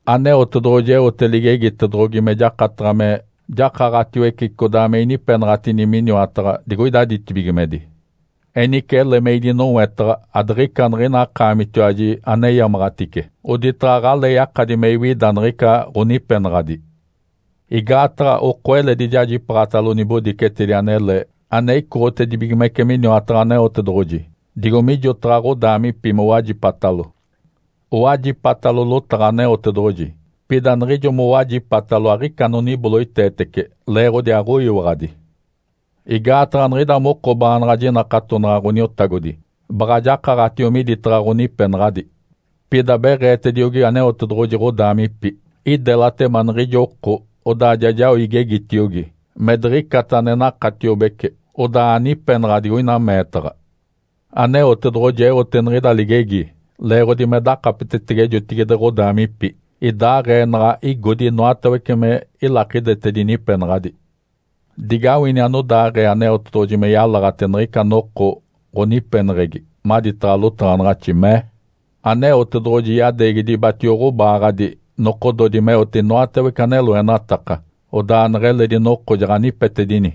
Aneotedoɡ̶oji eote ligegitedoɡ̶ogi me jakataɡ̶a me jakaɡ̶atiwece codaa me inipenaɡ̶atini miniwataɡ̶a digoida ditibigimedi. Enice ele me idinowetaɡ̶a adiɡ̶ica niɡ̶ina akaamitiwaji aneyamaɡ̶atice, oditaɡ̶a aɡ̶alee yakadi me iwida niɡ̶ica ɡ̶onipenaɡ̶adi. Igaataɡ̶a oko eledi jajipaaɡ̶atalo nibodicetedi anele ane icoɡ̶otedibigimece miniwataɡ̶a Aneotedoɡ̶oji, digo mijotaɡ̶a ɡ̶odaamipi mowajipatalo. Owajipatalo lotaɡ̶a Aneotedoɡ̶oji, pida niɡ̶ijo mowajipatalo aɡ̶ica anoniboloiteetece leeɡ̶odi aɡ̶oyiwaɡ̶adi. Igaataɡ̶a niɡ̶ida moko baanaɡ̶a jinakatonaɡ̶a Ǥoniotagodi, baɡ̶a jakaɡ̶atio miditaɡ̶a ɡ̶onipenaɡ̶adi. Pida beɡ̶eetediogi Aneotedoɡ̶oji ɡ̶odaamipi, “Idelatema niɡ̶ijo oko odaa ja jao igegitiogi me diɡ̶icata ane nakatiobece odaa anipenaɡ̶a digoina meetaɡ̶a”. Aneotedoɡ̶oji eote niɡ̶ida ligegi leeɡ̶odi me dakapetetege jotigide ɡ̶odaamipi idaaɡ̶ee naɡ̶a igodi inoatawece me ilakidetedi nipenaɡ̶adi. Digawini anodaaɡ̶ee Aneotedoɡ̶oji me yalaɡ̶ate niɡ̶ica noko ɡ̶onipeneɡ̶egi maditaɡ̶a lotaɡ̶anaɡ̶axi, mee, “Aneotedoɡ̶oji yadeegi dibatio ɡ̶obaaɡ̶adi nokododi meote inoatawece ane loenataka, odaa neɡ̶eledi noko jaɡ̶anipetedini.”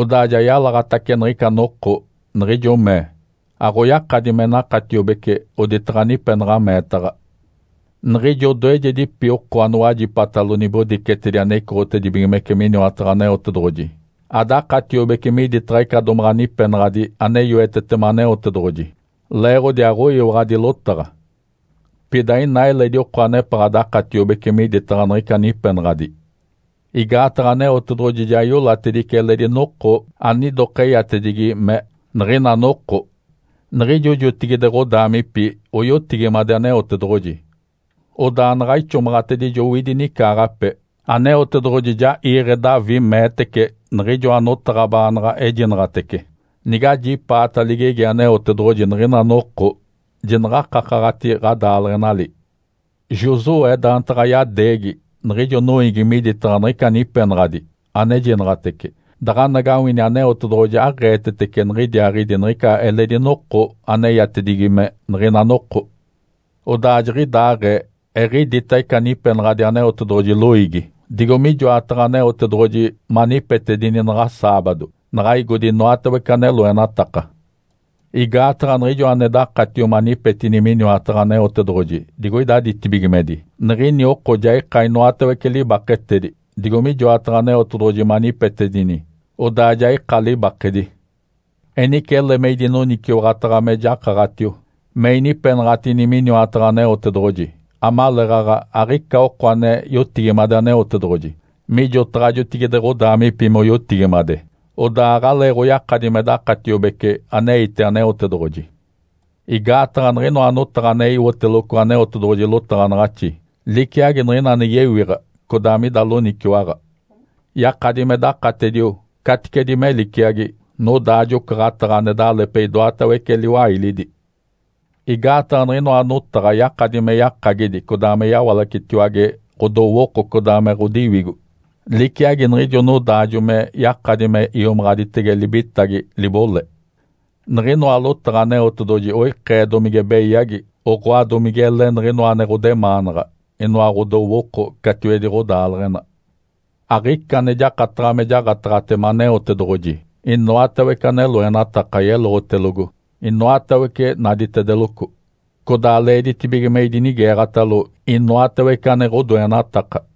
Odaa ja yalaɡ̶atace niɡ̶ica noko, niɡ̶ijo mee, “Aɡ̶oyakadi me nakatiobece oditaɡ̶a nipenaɡ̶a meetaɡ̶a.” Niɡ̶ijo odoejedipi oko anowajipatalo nibodicetedi ane icoɡ̶otedibigimece miniwataɡ̶a Aneotedoɡ̶oji adakatiobece miditaɡ̶a ica domaɡ̶a nipenaɡ̶adi ane yoetetema Aneotedoɡ̶oji, leeɡ̶odi aɡ̶oyiwaɡ̶adi lotaɡ̶a. Pida ina eledi oko anepaɡ̶a dakatiobece miditaɡ̶a niɡ̶ica nipenaɡ̶adi. Igaataɡ̶a Aneotedoɡ̶oji ja iolatedice eledi noko anidokeyatedigi me “Niɡ̶ina noko”. Niɡ̶ijo jotigide ɡ̶odaamipi oyotigimade Aneotedoɡ̶oji. Odaa naɡ̶a ixomaɡ̶atedijo owidi nicaaɡ̶ape, Aneotedoɡ̶oji ja iiɡ̶e Davi meetece niɡ̶ijoa notaɡ̶a baanaɡ̶a ejinaɡ̶atece, “Nigajipaata ligegi Aneotedoɡ̶oji niɡ̶ina noko, jinaɡ̶a akakaɡ̶ati ɡ̶adaaleɡ̶enali!” Josué daantaɡ̶a yadeegi niɡ̶ijo noiigi miditaɡ̶a niɡ̶ica nipenaɡ̶adi anejinaɡ̶atece, daɡ̶anagawini Aneotedoɡ̶oji aɡ̶eetetece niɡ̶idiaaɡ̶idi niɡ̶ica eledi noko aneyatedigi me “Niɡ̶ina noko”. Odaa jiɡ̶idaaɡ̶ee eɡ̶idita ica nipenaɡ̶adi Aneotedoɡ̶oji loiigi, digo mijoataɡ̶a Aneotedoɡ̶oji manipetedini naɡ̶a saabado naɡ̶a igodi inoatawece ane loenataka. Igaataɡ̶a niɡ̶ijo ane dakatio manipetini miniwataɡ̶a Aneotedoɡ̶oji digoida ditibigimedi, niɡ̶ini oko ja ika inoatawece libaketedi, digo mijoataɡ̶a Aneotedoɡ̶oji manipetedini odaa ja ika libakedi. Enice ele me idinoniciwaɡ̶ataɡ̶a me jakaɡ̶atio, me inipenaɡ̶atini miniwataɡ̶a Aneotedoɡ̶oji, amaleeɡ̶aɡ̶a aɡ̶ica oko ane yotigimade Aneotedoɡ̶oji mijotaɡ̶a jotigide ɡ̶odaamipi moyotigimade, odaa aɡ̶aleeɡ̶oyakadi me dakatiobece aneite Aneotedoɡ̶oji. Igaataɡ̶a niɡ̶inoa notaɡ̶a ane iwoteloco Aneotedoɡ̶oji lotaɡ̶anaɡ̶axi liciagi niɡ̶ina ane yewiɡ̶a codaa mida loniciwaɡ̶a. Yakadi me dakatedio caticedi me liciagi nodaajo-ocaɡ̶ataɡ̶a ane dalepe idoatawece liwailidi. Igaataɡ̶a niɡ̶inoa notaɡ̶a yakadi me yakagidi codaa me yawalacetiwage ɡ̶odowooko codaa me ɡ̶odiwigo, liciagi niɡ̶ijo nodaajo me yakadi me iomaɡ̶aditege libitagi, libole. Niɡ̶inoa lotaɡ̶a Aneotedoɡ̶oji oikee domige beyagi, oɡ̶oa, domigele niɡ̶inoa ane ɡ̶odemaanaɡ̶a, inoa ɡ̶odowooko catiwedi ɡ̶odaaleɡ̶ena. Aɡ̶ica ane jakataɡ̶a me jaɡ̶ataɡ̶atema Aneotedoɡ̶oji. Inoatawece ane loenataka yeloɡ̶otelogo, inoatawece naditedeloco. Codaa leeditibige me idinigeeɡ̶atalo, inoatawece ane ɡ̶odoenataka.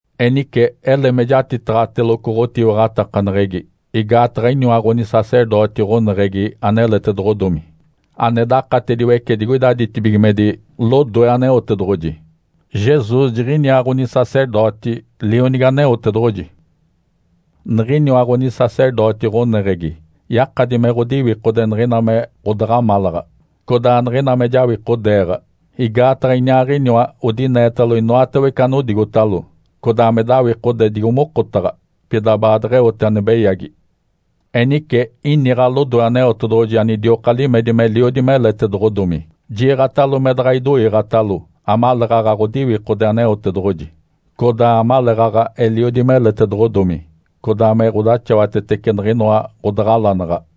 Enice ele me jatitaɡ̶ateloco ɡ̶otiwaɡ̶atakaneɡ̶egi, igaataɡ̶a iniwa ɡ̶onisacerdoti ɡ̶oneɡ̶egi aneletedoɡ̶odomi, ane dakatediwece digoida ditibigimedi, lodoe Aneotedoɡ̶oji. Jesus jiɡ̶iniaa ɡ̶onisacerdoti, Lionigi Aneotedoɡ̶oji. Niɡ̶iniwa ɡ̶onisacerdoti ɡ̶oneɡ̶egi yakadi me ɡ̶odiwikode niɡ̶ina me ɡ̶odaɡ̶amalaɡ̶a, codaa niɡ̶ina me jawikodeeɡ̶a, igaataɡ̶a Iniaaɡ̶iniwa odineetalo inoatawece anodigotalo, codaa me dawikode digo mokotaɡ̶a, pida baadeɡ̶eote ane beyagi. Enice iniɡ̶a lodoe Aneotedoɡ̶oji anidioka limedi meliodi meletedoɡ̶odomi, jiiɡ̶atalo me daɡ̶a idoiiɡ̶atalo amaleeɡ̶aɡ̶a ɡ̶odiwikode Aneotedoɡ̶oji, codaa amaleeɡ̶aɡ̶a eliodi meletedoɡ̶odomi, codaa me ɡ̶odaxawatetece niɡ̶inoa ɡ̶odaɡ̶alanaɡ̶a.